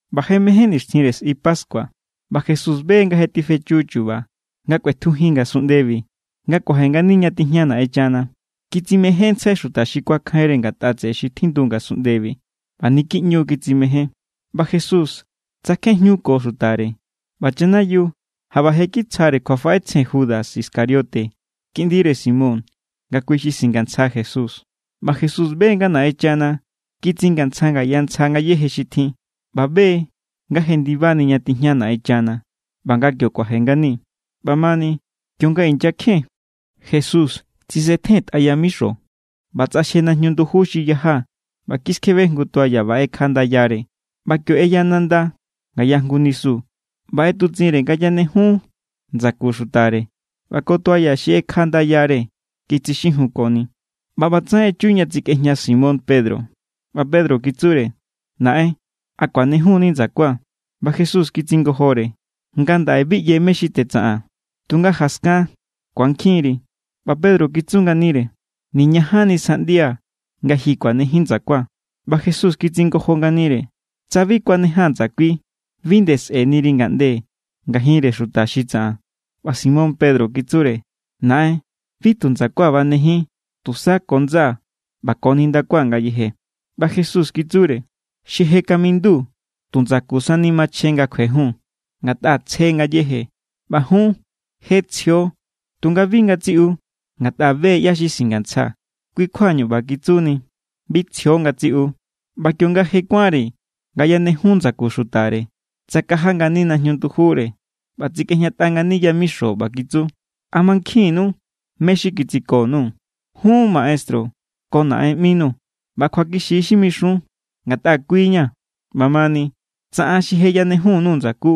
ꞌBa je mején nixtjinre sꞌi pascua ꞌba Jesús be= nga je tifechu chu̱ba̱ nga kꞌuetjujin ngasunꞌndebi nga kuaje ngani ña tijña Naꞌenchana. Kitsimejénntsjai xuta xi kuakjainre ngatꞌa tseꞌe xi tjindu ngasunꞌndebi, ꞌba niki ꞌñu= kitsimején. ꞌBa Jesús tsakjen jñuko xutare, ꞌba chanayiu jaꞌba je kitsjare kjuafaꞌetsjen Judas Iscariote kiꞌndire Simón nga kui xi singantsja Jesús. ꞌBa Jesús be= nga Naꞌenchana kitsingantsja ngaya ntsja ngayéje xi tjin, ꞌba be= nga jendibani ña tijña Naꞌenchana ꞌba nga kio kuaje ngani. ꞌBamani, kionga inyakjen, Jesús tsisetjentꞌa yamixo ꞌba tsꞌaxje najñu nduju xi yaja ꞌba kiskjebe jngu toalla ꞌba ꞌekja ndayare. ꞌBa kio ꞌeya nanda ngaya jngu nisu ꞌba ꞌetutsꞌinre nga yanejun ndsaku xutare ꞌba ko toalla xi ꞌekja ndayare kitsixijunkoni. ꞌBa ꞌbatsaꞌen echu ña tsikꞌejña Simón Pedro. ꞌBa Pedro kitsure: —Naꞌen, ¿a kuanejun=ni ndsakua̱? ꞌBa Jesús kitsingojore: —Ngandaꞌe bi ꞌye mé= xi tetsaꞌaa̱n, tunga jaskan ku̱ankjinri. ꞌBa Pedro kitsu nganire: —Niñajanni sjaꞌndia̱ nga ji kuanejin ndsakua̱. ꞌBa Jesús kitsingojo nganire: —Tsa bi kuanejaa̱n ndsakui, bi nde sꞌe̱niri ngaꞌnde ngajinre xuta xi tsaꞌan. ꞌBa Simón Pedro kitsure: —Naꞌen, bi tu ndsakua̱ banejin, tusa ko ndsaa̱ ꞌba ko nindakua̱ ngayeje. ꞌBa Jesús kitsure: —Xi je kamindu tu ndsaku sani machjen nga kjuejun, ngatꞌa tsje ngayéje. ꞌBa jun je tsjio, tunga bi ngatsiꞌu. Ngatꞌa be= ꞌyá= xi singantsja, kui= kjuañu ꞌba kitsuni: “Bi tsjio ngatsiꞌu.” ꞌBa kionga je kuánre nga yanejun ndsaku xutare, tsakaja ngani najñu ndujure ꞌba tsikꞌejñatꞌa ngani yamixo ꞌba kitsu: —¿A mankjinnu mé= xi kitsiko_nuu̱? Jun maestru ko naꞌen ꞌminuu̱. ꞌBa kjuakixi= xi mixun, ngatꞌa kui= ña̱. ꞌBamani, tsa an xi je yanejun_nuu̱ ndsakú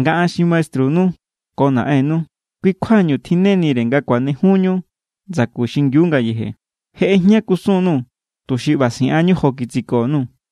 nga an xi maestrunu ko naꞌennu, kui= kjuañu tjinnenire nga kuanejunñu ndsaku xingiu ngayeje. Je ꞌejña kusun_nuu̱, tuxi ꞌba siꞌanñu jo kitsiko_nuu̱.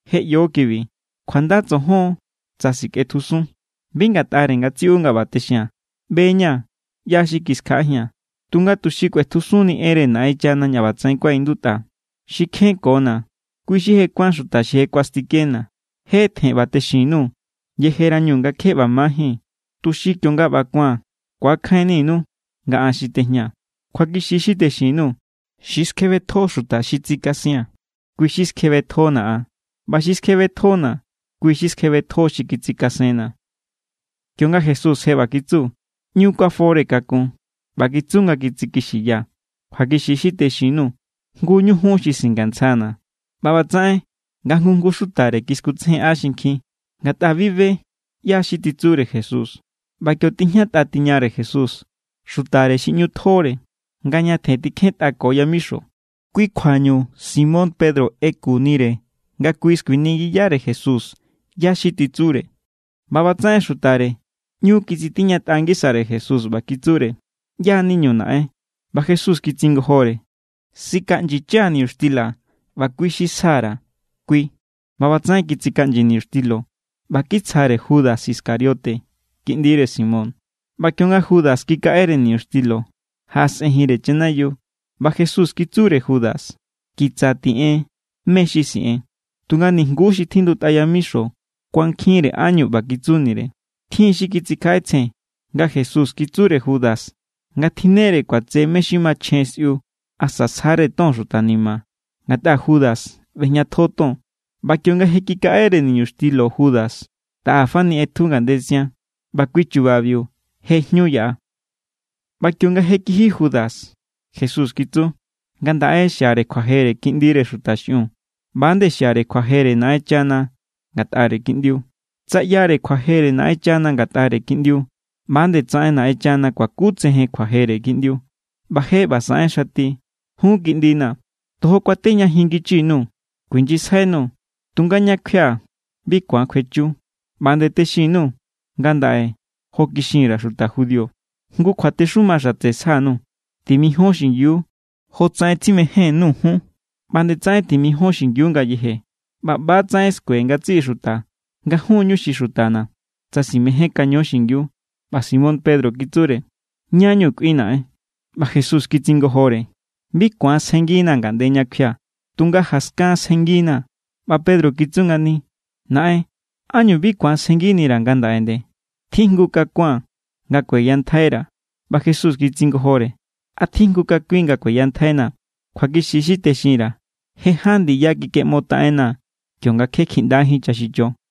Je ꞌyo kibi. Kjuanda tsojon tsa sikꞌetjusun. ’Bi ngatꞌare ngatsiꞌu nga ꞌba texia̱n. ꞌBe=ña̱ ꞌyá xi kiskjaꞌajia̱n. Tunga tuxi kꞌuetjusunnini enre Naꞌenchana ña ꞌbatsaꞌen kuaꞌindutꞌa: “Xi kjenkona̱, kui= xi je kuán xuta xi kuastikena̱.” Je tjen ꞌba texin_nuu̱ yejerañu nga kje ꞌba majín, tuxi kionga ꞌba ku̱an ku̱akjainninu nga an xi tejñaa̱. Kjuakixi= xi texin_nuu̱. Xi skjebetjo xuta xi tsikasia̱n, kui= xi skjebetjona̱ an. ꞌBa xi skjebetjona̱, kui= xi skjebetjo xi kitsikasenna̱. Kionga Jesús je ꞌba kitsu, ꞌñu kuafore kakun ꞌba kitsu nga kitsikixiya: —Kjuakixi= xi texin_nuu̱. Jngu ñu jun xi singantsjana̱. ꞌBa ꞌbatsaꞌen nga jngu jngu xutare kiskutsejenꞌa xinkjin, ngatꞌa bi be ꞌyá= xi titsure Jesús. ꞌBa kio tijñatꞌa tiñare Jesús xutare xi ꞌñu tjore, nga ñatjen tikjentꞌako yamixo. Kui kjuañu Simón Pedro ꞌekunire nga kui skuiningiyare Jesús ꞌyá= xi titsure. ꞌBa ꞌbatsaꞌen xutare ꞌñu kitsitiñatꞌa ngisare Jesús ꞌba kitsure: —¿ꞌYá= niñu, naꞌen? ꞌBa Jesús kitsingojore: —Sikaꞌnyicha̱ niñuxtila ꞌba kui xi sja_ra̱, kui. ꞌBa ꞌbatsaꞌen kitsikaꞌnyi niñuxtilo ꞌba kitsjare Judas Iscariote, kiꞌndire Simón. ꞌBa kionga Judas kikaꞌere niñuxtilo, jaꞌasꞌenjinre chanayiu. ꞌBa Jesús kitsure Judas: —Kitsa tiꞌen mé= xi siꞌen. Tunga nijnguú xi tjindutꞌa yamixo kuankjinre ánñu ꞌba kitsunire. Tjin= xi kitsikjaꞌetsjen nga Jesús kitsure Judas nga tjinnere kuatse mé= xi machjen sꞌiu asa sjare ton xuta ni̱ma̱, ngatꞌa Judas ꞌbejñatjo ton. ꞌBa kionga kikaꞌere niñuxtilo Judas, taꞌa fani ꞌetju ngandetsian. ꞌBa kui chubabiu je jñu yaꞌa. ꞌBa kionga je kiji Judas, Jesús kitsu: —Ngandaꞌe xiare kjuajere Kiꞌndire Xuta xiꞌiun, ꞌba=nde xiare kjuajere Naꞌenchana ngatꞌare Kiꞌndiu. Tsa ꞌyare kjuajere Naꞌenchana ngatꞌare Kiꞌndiu, ꞌba=nde tsaꞌen Naꞌenchana kuakutsejen kjuajere Kiꞌndiu, ꞌba je ꞌba saꞌen xati. Jun kiꞌndina̱, tojo kuatejñajin ngichi_nuu̱. kuijnyisjainuu̱, tunga ña kjuia̱ bi ku̱an kjuechu. ꞌBa nde texin_nuu̱ ngandaꞌe jo kixin_ra̱ xuta judío. Jngu kjuatexuma xatse sja_nuu̱: timijón xingiu. Jotsaꞌen tsimején_nuu̱ jun, ꞌba=nde tsaꞌen timijon xingiu ngayeje. ꞌBa ꞌba=tsaꞌen skue ngatsiꞌi xuta nga jun= ñu xi xutana̱, tsa simejénkaño xingiu. ꞌBa Simón Pedro kitsure: —¿Ñá=ñu kꞌuin, naꞌen? ꞌBa Jesús kitsingojore: —Bi ku̱an sjennginaa̱ ngandaꞌe ña kjuia̱, tunga jaskan sjennginaa̱. ꞌBa Pedro kitsu ngani: —Naꞌen, ¿ánñu bi ku̱an sjennginira̱ ngandaꞌe nde? Tjijngu kakua̱n nga kueyantjaira̱. ꞌBa Jesús kitsingojore: —¿A tjijngu kakuin nga kueyantjainaa̱? Kjuakixi= xi texinra̱. Je ján ndiya kikeꞌmotaꞌennaa̱ kionga kje kjiꞌndajín chaxicho.